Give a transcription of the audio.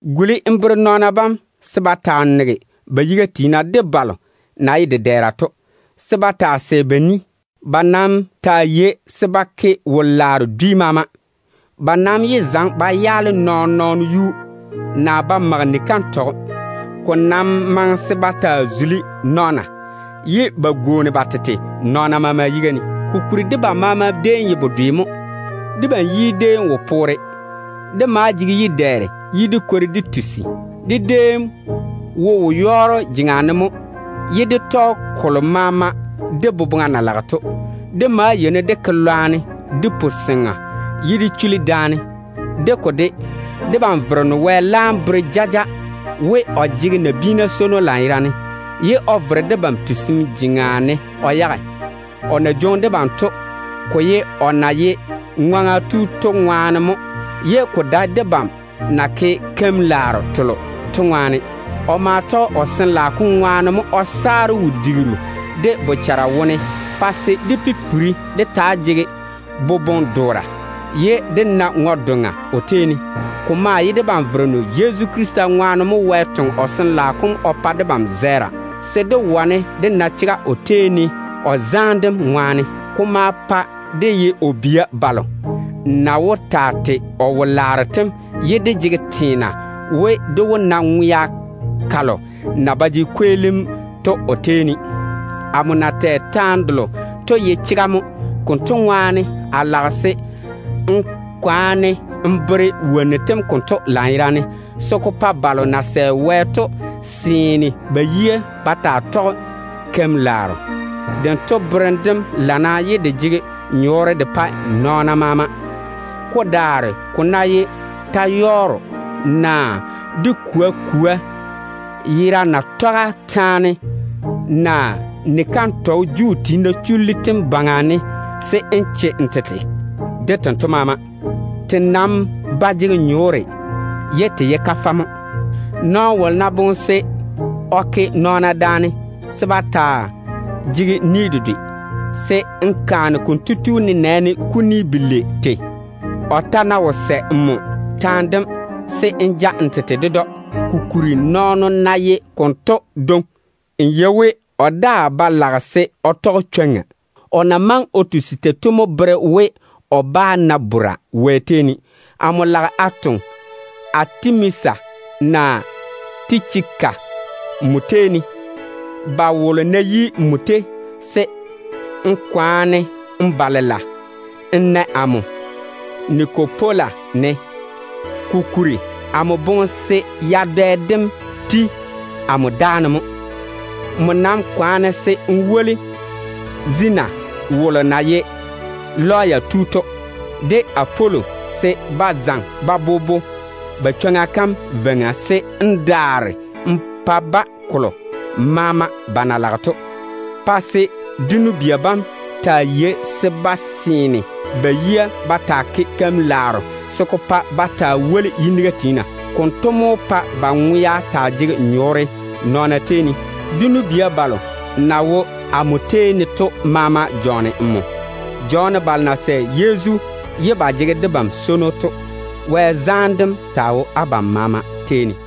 Guli n bere nɔɔna bam se ba taa nege ba yiga tiina de balo na ye dedɛɛra to, se ba taa sɛ ba ni. Ba nam taa yei se ba ke wo-laaro dwi maama. Ba nam yé zaŋe ba yaale nɔɔn-nɔɔno yuu, naa ba mage ni-kantɔgɔ. Ko nam maŋe se ba taa zuli nɔɔna, ye ba gwooni ba tete nɔɔna maama yiga ne. Kokuri debam maama déem ye bedwe mo. Debam yi déem wo poore. Dé maa jege yi-dɛɛre ye dé kwori dé tusi. Dé déem wo wo-yɔɔro jeŋa ne mo ye dé tɔge kolo maama dé boboŋa na lage to. Dé maa yeini dé ke lwarem de puseŋa, ye dé chuli daane. De ko de, debam Vereno Wɛ wom laam bere jaja we, o jege nabiina swono lanyerane, ye o vere debam wɛleera jeŋa ne o yage. O na jwoŋi debam o yage to, ko ye o na ye ŋwaŋa tu to ŋwaane mo, ye ko dae debam na ke keim-laaro telo to ŋwaane. O ma tɔge o Sin-laao kom ŋwaane mo o saare wo-digiru dé bochara wone, pa se dé pipiri dé taa jege boboŋ-doora, ye dé na ŋwe-doŋa o tei ne. Ko maa ye debam Vereno Yezu Krista ŋwaane mo Wɛ toŋe o Sin-laao kom o pa debam zɛɛra, se dé wane dé na chega o tei ne o zaane dem ŋwaane. Ko maa pae dé ye o bia balo na wó taa tei o wo-laaro tem to. Dé maa jege teena we, dé wó na ŋwea kalo na ba jege kweelim o tei ne to. Amo na tɛ taane delo to ye berem chekke mo. Konto ŋwaane, a lage se n kwaane n zege wonnu tem konto chega kam kwaga ne, se ko pa balo na sɛ Wɛ to seene ba yia ba taa tɔge keim-laaro. Dento berem dem lana, ye de jege nyɔɔre de pae nɔɔna maama. Ko daare ko ná ye ta-yɔɔro, naa dé kwoa kwoa yera natɔga taane, naa ni-kantɔgɔ Juu tiina chullu tem baŋa ne, se n che n tete de tento maama. Te nam ba jege nyɔɔre ye te ye kafɛ mo. Nɔɔno wolo ná boŋe se o ke nɔɔna daane se ba yé taa jege ni dedwe, se n kaane konto tu nenɛɛne kuni belei tei. O ta ná wo sɛ nmo taane dem, se n ja n tete ded‑o. Kokuri, nɔɔno ná ye konto dwoŋi, n yei we o daa ba lage se o tɔge chwoŋa. O na maŋe o tusi tei to mo bere we, o bá na bora Wɛ tei ne. Amo lage a toŋe Atimasa naa Tichika nmo tei ne. Ba wolo ná yi nmo tei, se n kwaane n ba lela n na amo Nikopola ne, kokuri amo boŋe se yadɛ dem ti amo dáane mo. Nmo nam kwaane se n woli Apolo, de Zenase wolo na ye lɔya tu to, se ba zaŋe ba bobo ba chwoŋa kam veiŋa, se n daare n pa-ba kolo maama ba na lage to. Pa se dé nu-bia bam taa yei se ba seene ba yia ba taa ke keim-laaro telo na wó woli nɔɔna ba gɛɛre wone. Konto mo wó pa ba ŋwea taa jege nyɔɔre nɔɔna tei ne. Dé nu-bia balo na wo amo tei ne to maama jɔɔne nmo. Jɔɔne balo na sɛ Yezu ye ba jege debam swono to. Wɛ zaane dem taa wo abam maama tei ne.